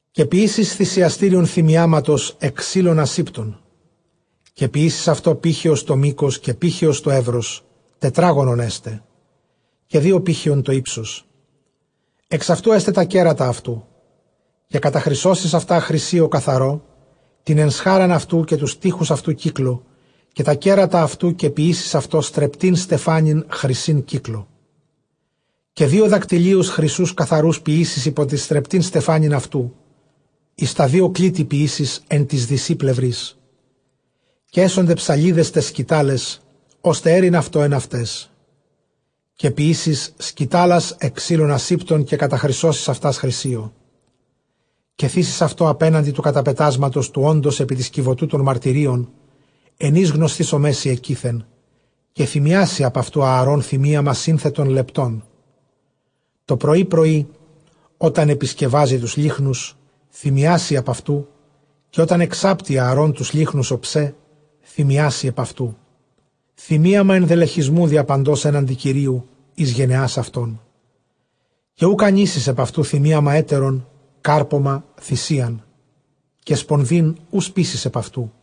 Καὶ ποιήσεις θυσιαστήριον θυμιάματος ἐκ ξύλων ἀσήπτων. Καὶ ποιήσεις αὐτὸ πήχεος τὸ μῆκος, καὶ πήχεος τὸ εὖρος· τετράγωνον ἔσται· καὶ δύο πήχεων τὸ ὕψος· ἐξ αὐτοῦ ἔσται τὰ κέρατα αὐτοῦ. Καὶ καταχρυσώσεις χρυσίῳ καθαρῷ τὴν ἐσχάραν αὐτοῦ, καὶ τοὺς τοίχους αὐτοῦ κύκλῳ, καὶ τὰ κέρατα αὐτοῦ· καὶ ποιήσεις αὐτῷ στρεπτὴν στεφάνην χρυσῆν κύκλῳ. Καὶ δύο δακτυλίους χρυσοῦς καθαροὺς ποιήσεις ὑπὸ τὴν στρεπτὴν στεφάνην αὐτοῦ, εἰς τὰ δύο κλίτη ποιήσεις ἐν τοῖς δυσὶ πλευροῖς· καὶ ἔσονται ψαλίδες ταῖς σκυτάλαις, ὥστε αἴρειν αὐτὸ ἐν αὐταῖς. Καὶ ποιήσεις σκυτάλας ἐκ ξύλων ἀσήπτων, καὶ καταχρυσώσεις αὐτὰς χρυσίῳ. Καὶ θήσεις αὐτὸ ἀπέναντι τοῦ καταπετάσματος, τοῦ ὄντος ἐπὶ τῆς κιβωτοῦ τῶν μαρτυρίων, ἐν οἷς γνωσθήσομαί σοι ἐκεῖθεν. Καὶ θυμιάσει ἐπʼ αὐτοῦ Ἀαρὼν θυμίαμα σύνθετον λεπτὸν τὸ πρωῒ πρωΐ· ὅταν ἐπισκευάζῃ τοὺς λύχνους, θυμιάσει ἐπʼ αὐτοῦ. Καὶ ὅταν ἐξάπτῃ Ἀαρὼν τοὺς λύχνους ὀψὲ, θυμιάσει ἐπʼ αὐτοῦ. θυμίαμα ἐνδελεχισμοῦ διαπαντὸς ἔναντι Κυρίου εἰς γενεὰς αὐτῶν. Καὶ οὐκ ἀνοίσει ἐπʼ αὐτοῦ θυμίαμα ἕτερον· κάρπωμα, θυσίαν, και σπονδὴν οὐ σπείσεις ἐπʼ αὐτοῦ.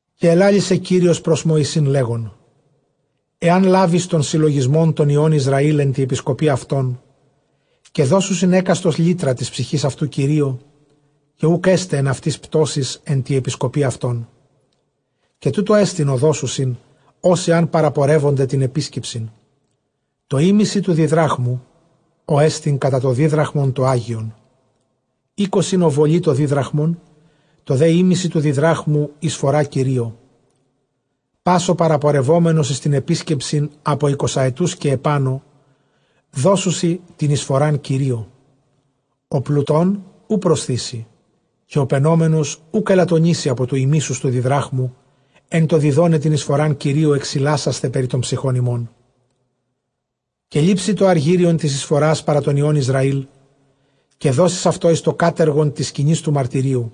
Καὶ ἑλάλησε Κύριος πρὸς Μωυσῆν, λέγων, ἐὰν λάβῃς τὸν συλλογισμὸν τῶν υἱῶν Ἰσραὴλ ἐν τῇ ἐπισκοπῇ αὐτῶν, καὶ δώσουσιν ἕκαστος λύτρα τῆς ψυχῆς αὐτοῦ Κυρίῳ, καὶ οὐκ ἔσται ἐν αὐτοῖς πτῶσις ἐν τῇ ἐπισκοπῇ αὐτῶν. Καὶ τοῦτό ἐστιν ὅ δώσουσιν ὅσοι ἂν παραπορεύωνται τὴν ἐπίσκεψιν· τὸ ἥμισυ τοῦ διδράχμου ὅ ἐστιν κατὰ τὸ δίδραχμον τὸ ἅγιον, εἴκοσι ὀβολοὶ τὸ δίδραχμον, τὸ δὲ ἥμισυ τοῦ διδράχμου εἰσφορὰ Κυρίῳ. Πᾶς ὁ παραπορευόμενος εἰς τὴν ἐπίσκεψιν ἀπὸ εἰκοσαετοῦς καὶ ἐπάνω, δώσουσι τὴν εἰσφορὰν Κυρίῳ. Ὁ πλουτῶν οὐ προσθήσει, καὶ ὁ πενόμενος οὐκ ἐλαττονήσει ἀπὸ τοῦ ἡμίσεως τοῦ διδράχμου ἐν τῷ διδόναι τὴν εἰσφορὰν Κυρίῳ, ἐξιλάσασθαι περὶ τῶν ψυχῶν ὑμῶν. Καὶ λήψῃ τὸ ἀργύριον τῆς εἰσφορᾶς παρὰ τῶν υἱῶν Ἰσραήλ, καὶ δώσεις αὐτὸ εἰς τὸ κάτεργον τῆς σκηνῆς τοῦ μαρτυρίου·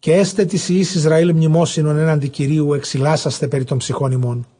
καὶ ἔσται τοῖς υἱοῖς Ἰσραὴλ μνημόσυνον ἔναντι Κυρίου, ἐξιλάσασθαι περὶ τῶν ψυχῶν ὑμῶν.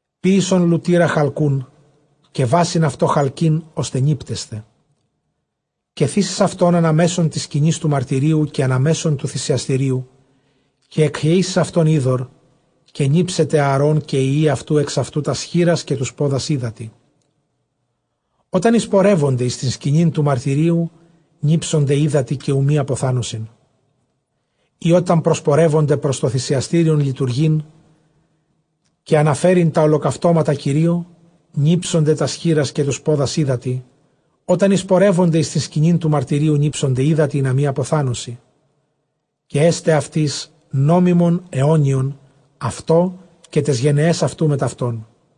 ποίησον λουτῆρα χαλκοῦν, καὶ βάσιν αὐτῷ χαλκῆν, ὥστε νίπτεσθαι· καὶ θήσεις αὐτὸν ἀνὰ μέσον τῆς σκηνῆς τοῦ μαρτυρίου καὶ ἀνὰ μέσον τοῦ θυσιαστηρίου· καὶ ἐκχεεῖς εἰς αὐτὸν ὕδωρ. Καὶ νίψεται Ἀαρὼν καὶ οἱ υἱοὶ αὐτοῦ ἑξ αὐτοῦ τὰς χεῖρας, καὶ τοὺς πόδας ὕδατι. Ὅταν εἰσπορεύωνται εἰς τὴν σκηνὴν τοῦ μαρτυρίου, νίψονται ὕδατι, καὶ οὐ μὴ ἀποθάνωσιν, ὅταν προσπορεύωνται πρὸς τὸ θυσιαστήριον λειτουργεῖν καὶ ἀναφέρειν τὰ ὁλοκαυτώματα Κυρίῳ. Νίψονται τὰς χεῖρας καὶ τοὺς πόδας ὕδατι, ὅταν εἰσπορεύωνται εἰς τὴν σκηνὴν τοῦ μαρτυρίου, νίψονται ὕδατι, ἵνα μὴ ἀποθάνωσι· καὶ ἔσται αὐτοῖς νόμιμον αἰώνιον, αὐτῷ καὶ ταῖς γενεαῖς αὐτοῦ μετʼ αὐτόν.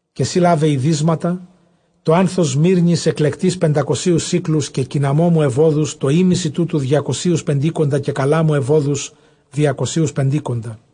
καὶ σὺ λάβε ἡδύσματα, τὸ ἄνθος σμύρνης ἐκλεκτῆς πεντακοσίους σίκλους, καὶ κινναμώμου εὐώδους τὸ ἥμισυ τούτου διακοσίους πεντήκοντα, καὶ καλάμου εὐώδους διακοσίους πεντήκοντα,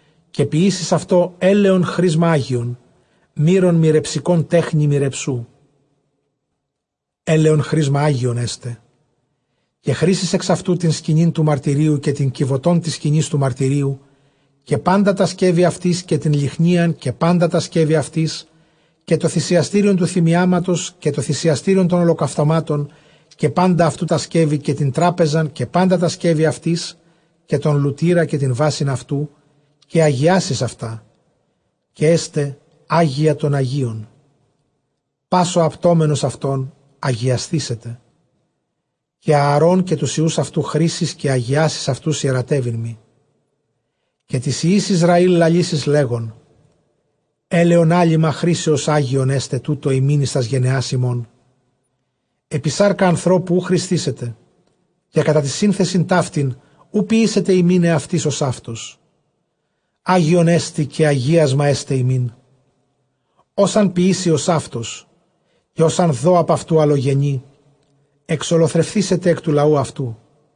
Καὶ ποιήσεις αὐτὸ ἔλαιον χρίσμα ἅγιον, μύρον μυρεψικὸν τέχνῃ μυρεψοῦ· ἔλαιον χρίσμα ἅγιον ἔσται. Καὶ χρίσεις ἐξ αὐτοῦ τὴν σκηνὴν τοῦ μαρτυρίου, καὶ τὴν κιβωτὸν τῆς σκηνῆς τοῦ μαρτυρίου, καὶ πάντα τὰ σκεύη αὐτῆς, καὶ τὴν λυχνίαν καὶ πάντα τὰ σκεύη αὐτῆς, καὶ τὸ θυσιαστήριον τοῦ θυμιάματος, καὶ τὸ θυσιαστήριον τῶν ὁλοκαυτωμάτων καὶ πάντα αὐτοῦ τὰ σκεύη, καὶ τὴν τράπεζαν καὶ πάντα τὰ σκεύη αὐτῆς, καὶ τὸν λουτῆρα. Καὶ ἁγιάσεις αὐτά· καὶ ἔσται ἅγια τῶν ἁγίων· πᾶς ὁ ἁπτόμενος αὐτῶν, ἁγιασθήσεται. Καὶ Ἀαρὼν καὶ τοὺς υἱοὺς αὐτοῦ χρίσεις, καὶ ἁγιάσεις αὐτοὺς ἱερατεύειν μοι. Καὶ τοῖς υἱοῖς Ἰσραὴλ λαλήσεις, λέγων, ἔλαιον ἄλειμμα χρίσεως ἅγιον ἔσται τοῦτο ὑμῖν εἰς τὰς γενεὰς ὑμῶν. Ἐπὶ σάρκα ἀνθρώπου οὐ χρισθήσεται· καὶ κατὰ τὴν σύνθεσιν ταύτην οὐ ποιήσετε ὑμῖν ἑαυτοῖς ὡσαύτως· ἅγιόν ἐστιν, καὶ ἁγίασμα ἔσται ὑμῖν. Ὃς ἂν ποιήσῃ ὡσαύτως, καὶ ὃς ἂν δῷ ἀπʼ αὐτοῦ ἀλλογενεῖ, ἐξολοθρευθήσεται ἐκ τοῦ λαοῦ αὐτοῦ.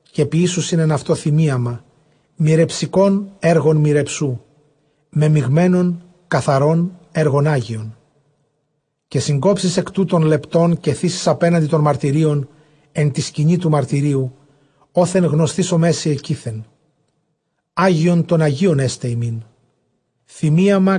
Καὶ ποιήσουσιν ἐν αὐτῷ θυμίαμα μυρεψικὸν ἔργον μυρεψοῦ μεμιγμένον, καθαρὸν ἔργον ἅγιον. Καὶ συνκόψεις ἐκ τούτων λεπτόν, καὶ θήσεις ἀπέναντι τῶν μαρτυρίων ἐν τῇ σκηνῇ τοῦ μαρτυρίου, ὅθεν γνωσθήσομαί σοι ἐκεῖθεν· ἅγιον τῶν ἁγίων ἔσται ὑμῖν θυμίαμα.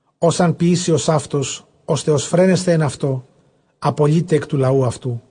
Ὃς ἂν ποιήσῃ ὡσαύτως ὥστε ὀσφραίνεσθαι ἐν αὐτῷ, ἀπολεῖται ἐκ τοῦ λαοῦ αὐτοῦ.